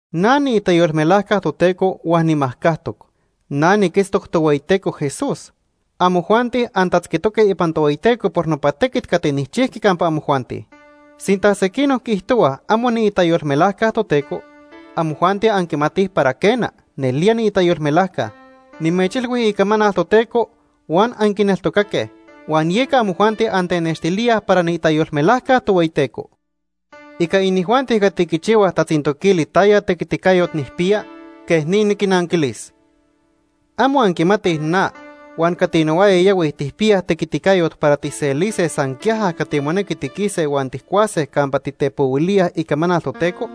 Na niitayolmelajca Toteco huan nimajcajtoc. Na niquitztoc Tohueyiteco Jesús. Amojuanti antatzquitoque ipan Tohueyiteco por nopa tequit cati nijchijqui campa amojuanti. Sinta sequinoc quiijtohuaj amo niitayolmelajca Toteco, amojuanti anquimatij para quena, nelía niitayolmelajca. Nimechilhui icamanal Toteco huan anquineltocaque, huan yeca amojuanti antenextilíaj para niitayolmelajca Tohueyiteco. Ica inijuanti cati quichihuaj tatzintoquili taya tequiticayot nijpiya, quej ni niquinnanquilis. ¿Amo anquimatij na huan cati nohuaya yahuij tijpiyaj tequiticayot para tijselise san quiaja cati monequi tiquise huan tijcuase campa titepohuilíaj icamanal Toteco?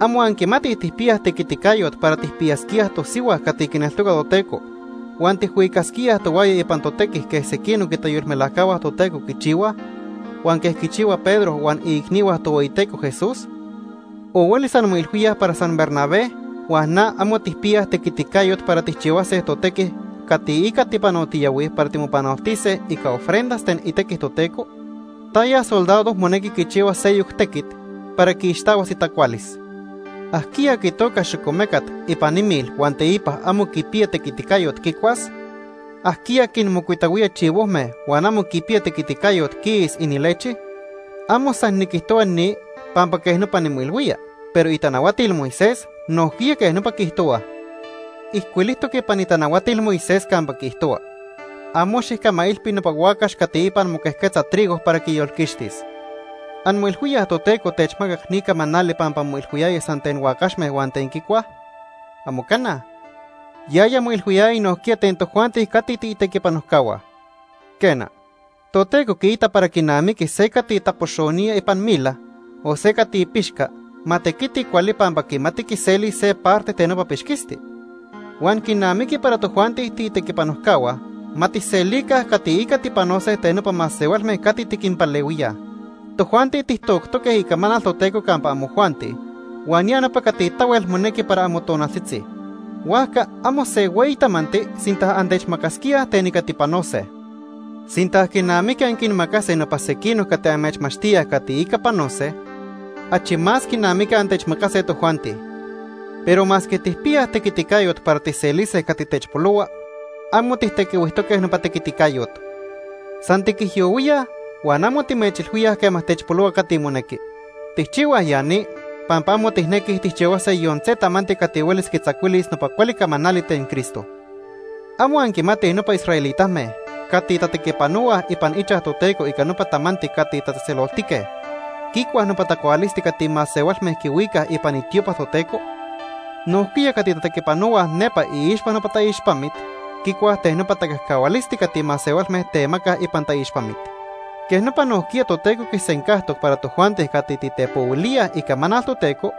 ¿Amo anquimatij tijpiyaj tequiticayot para tijpiyasquíaj tosihua cati quineltoca Toteco huan tijhuicasquíaj tohuaya ipan totequi quej sequinoc itayolmelajcahua Toteco quichihuaj, huan quej quichihua Pedro huan iicnihua Tohueyiteco Jesús? ¿O huelis anmoilhuíaj para san Bernabé huan na amo tijpiyaj tequiticayot para tijcahuase totequi cati ica tipanotiyahuij para timopanoltise ica ofrendas ten itequi Toteco? ¿Taya soldado monequi quichihuas seyoc tequit para quiixtahuas itacualis? ¿Ajquiya quitoca xocomecat ipan imil huan teipa amo quipiya tequiticayot quicuas? ¿Ajquiya quinmocuitahuía chivojme huan amo quipiya tequiticayot quiis inilechi? Amo san niquijtohua ni pampa quej nopa nimoilhuía, pero itanahuatil Moisés nojquiya quej nopa quiijtohuaj. Ijcuilijtoc ipan itanahuatil Moisés campa quiijtohua: “Amo xijcamailpi nopa huacax cati ipan moquejquetza trigo para quiyolquixtis.” ¿Anmoilhuíaj Toteco techmacac ni camanali pampa moilhuiyaya san ten huacaxme huan ten quicuaj? ¡Amo cana! Yaya moilhuiyaya nojquiya ten tojuanti cati tiitequipanojcahua. Quena, Toteco quiita para quinamiqui se cati tapoxonía ipan mila, o se cati pixca, ma tequiti cuali pampa quimati quiselis se parte ten nopa pixquisti. Huan quinamiqui para tojuanti tiitequipanojcahua, ma tijselica cati ica tipanose ten nopa masehualme cati tiquinpalehuíaj. Tojuanti tijtoctoque icamanal Toteco campa amojuanti huan ya nopa cati tahuel monequi para amotonaltzitzi, huajca amo se hueyi tamanti sinta antechmacasquíaj ten ica tipanose. Sinta quinamiqui anquinmacase nopa sequinoc cati amechmachtíaj cati ica panose, achi más quinamiqui antechmacase tojuanti. Pero masque tijpiyaj tequiticayot para tijselise cati techpolohua, amo tijtequihuijtoque nopa tequiticayot. San tiquijyohuíaj, huan amo timechilhuíaj quema techpolohua cati monequi. Tijchihuaj ya ni pampa amo tijnequij tijchihuase yon se tamanti cati huelis quitzacuilis nopa cuali camanali ten Cristo. ¿Amo anquimatij nopa israelitame cati tatequipanohuaj ipan ichaj Toteco ica nopa tamanti cati tatzejtzeloltique, quicuaj nopa tacualisti cati masehualme quihuicaj ipan itiopa Toteco? Nojquiya cati tatequipanohuaj nepa iixpa nopa taixpamit, quicuaj ten nopa tacajcahualisti cati masehualme temacaj ipan taixpamit. Quej nopa nojquiya Toteco quisencajtoc para tojuanti cati titepohuilíaj icamanal Toteco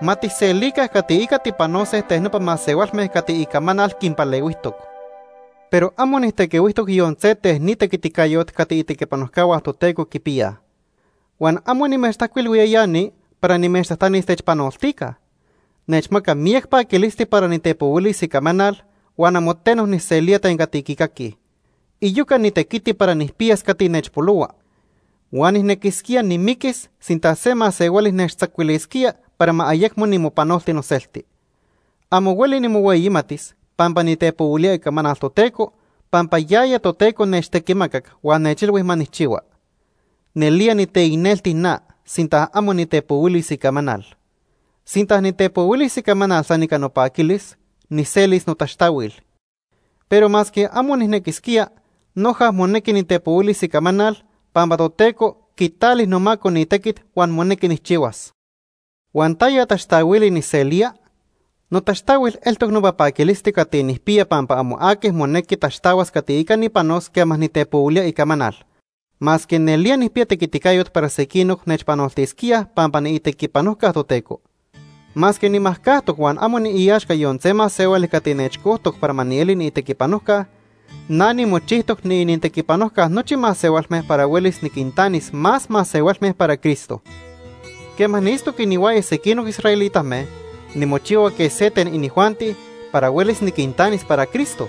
ma tijselica cati ica tipanose ten nopa masehualme cati icamanal quinpalehuijtoc. Pero amo nijtequihuijtoc yon se ten ni tequiticayot cati itequipanojcahua Toteco quipiyaj. Huan amo nimechtajcuilhuía ya ni para nimechtajtanis techpanoltica. Nechmaca miyac paquilisti para nitepohuilis icamanal huan amo teno nijselía ten cati quicaquij. Iyoca nitequiti para nijpiyas cati nechpolohua. Huan nijnequisquía nimiquis sinta se masehuali nechtzacuilisquía para ma ayecmo nimopanolti noselti. Amo hueli nimohueyimatis pampa nitepohuilía icamanal Toteco pampa yaya Toteco nechtequimacac huan nechilhui ma nijchihua. Nelía niteicnelti na sinta amo nitepohuilis icamanal. Sinta nitepohuilis icamanal san ica nopaquilis, nijselis notaxtahuil. Pero masque amo nijnequisquía, noja monequi nitepohuilis icamanal, pampa Toteco quitali nomaco ni tequit huan monequi nijchihuas. Huan ¿taya taxtahuili nijselía? Notaxtahuil eltoc nopa paquilisti cati nijpiya pampa amo aqui monequi taxtahuas cati ica nipanos quema nitepohuilía icamanal, masque nelía nijpiya tequiticayot para sequinoc nechpanoltisquíaj pampa niitequipanojca Toteco. Masque nimajcajtoc huan amo niiaxca yon se masehuali cati nechcojtoc para ma nieli niitequipanojca, na nimochijtoc niinintequipanojca nochi masehualme para huelis niquintanis más masehualme para Cristo. Quema niitztoc inihuaya sequinoc israelitame, nimochihua quej se ten inijuanti para huelis niquintanis para Cristo.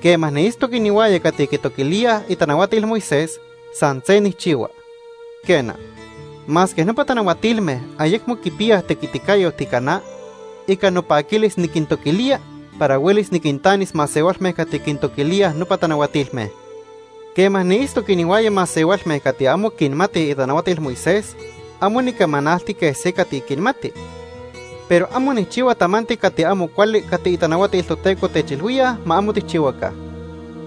Quema niitztoc inihuaya cati quintoquilíaj itanahuatil Moisés, san se nijchihua. Quena, masque nopa tanahuatilme ayecmo quipiyaj tequiticayot ica na, ica nopaquilis niquintoquilía para huelis niquintanis masehualme cati quintoquilíaj nopa tanahuatilme. Quema niitztoc inihuaya masehualme cati amo quinmatij itanahuatil Moisés, amo nicamanalti quej se cati quinmati. Pero amo nijchihua tamanti cati amo cuali cati itanahuatil Toteco techilhuíaj ma amo tijchihuaca.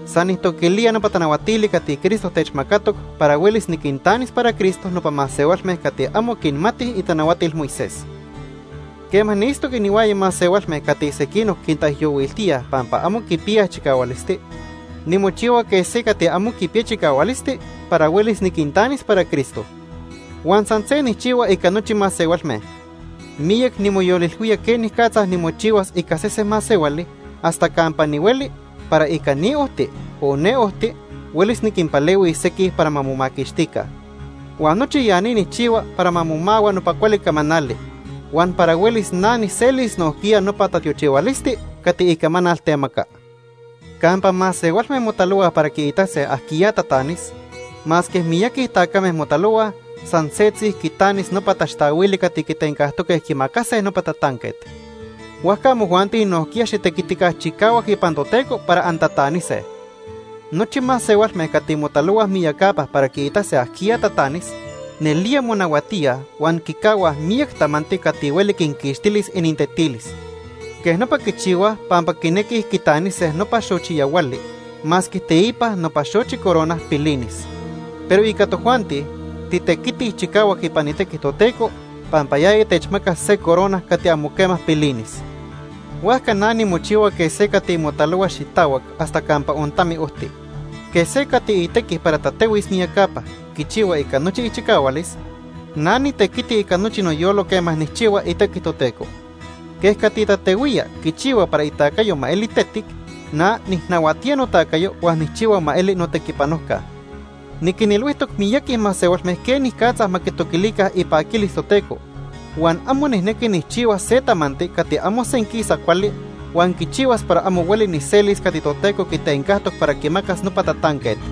San nijtoquilía nopa tanahuatili cati Cristo techmacatoc para huelis niquintanis para Cristo nopa masehualme cati amo quinmatij itanahuatil Moisés. Quema niitztoc inihuaya masehualme cati sequinoc quintaijyohuiltíaj pampa amo quipiyaj chicahualisti, nimochihua quej se cati amo quipiya chicahualisti para huelis niquintanis para Cristo. Huan san se nijchihua ica nochi masehualme. Miyac nimoyolilhuía quenicatza nimochihuas ica sese masehuali hasta campa nihueli para ica ni ojti, o ne ojti huelis niquinpalehuis sequij para ma momaquixtica. Huan nochi ya ni nijchihua para ma momahua nopa cuali camanali, huan para huelis na nijselis nojquiya nopa tatiochihualisti cati icamanal temaca. Campa masehualme motalohuaj para quiitase ajquiya tatanis, masque miyaqui tacame motalohuaj, san setzi quitanis nopa taxtahuili cati quitencajtoque quimacase nopa tatanquet. Huajca amojuanti nojquiya xitequitica chicahuac ipan Toteco para antatanise. Nochi masehualme cati motalohuaj miyacapa para quiitase ajquiya tatanis, nelía monahuatíaj huan quicahuaj miyac tamanti cati hueli quinquixtilis inintetilis. Quej nopa quichihuaj pampa quinequij quitanise nopa xochi yahuali masque teipa nopa xochi corona pilinis. Pero ica tojuanti, titequitij chicahuac ipan itequi Toteco pampa yaya techmacas se corona cati amo quema pilinis. Huajca na nimochihua quej se cati motalohua xitahuac hasta campa ontami ojti. Quej se cati itequi para tatehuis miyacapa, quichihua ica nochi ichicahualis, na nitequiti ica nochi noyolo quema nijchihua itequi Toteco. Quej cati tatehuía quichihua para itacayo ma eli tetic, na nijnahuatía notacayo huan nijchihua ma eli notequipanojca. Niquinilhuijtoc miyaqui masehualme quenicatza ma quitoquilica ipaquilis Toteco, huan amo nijnequi nijchihuas se tamanti cati amo senquisa cuali huan quichihuas para amo hueli nijselis cati Toteco quitencajtoc para quimacas nopa tatanquet.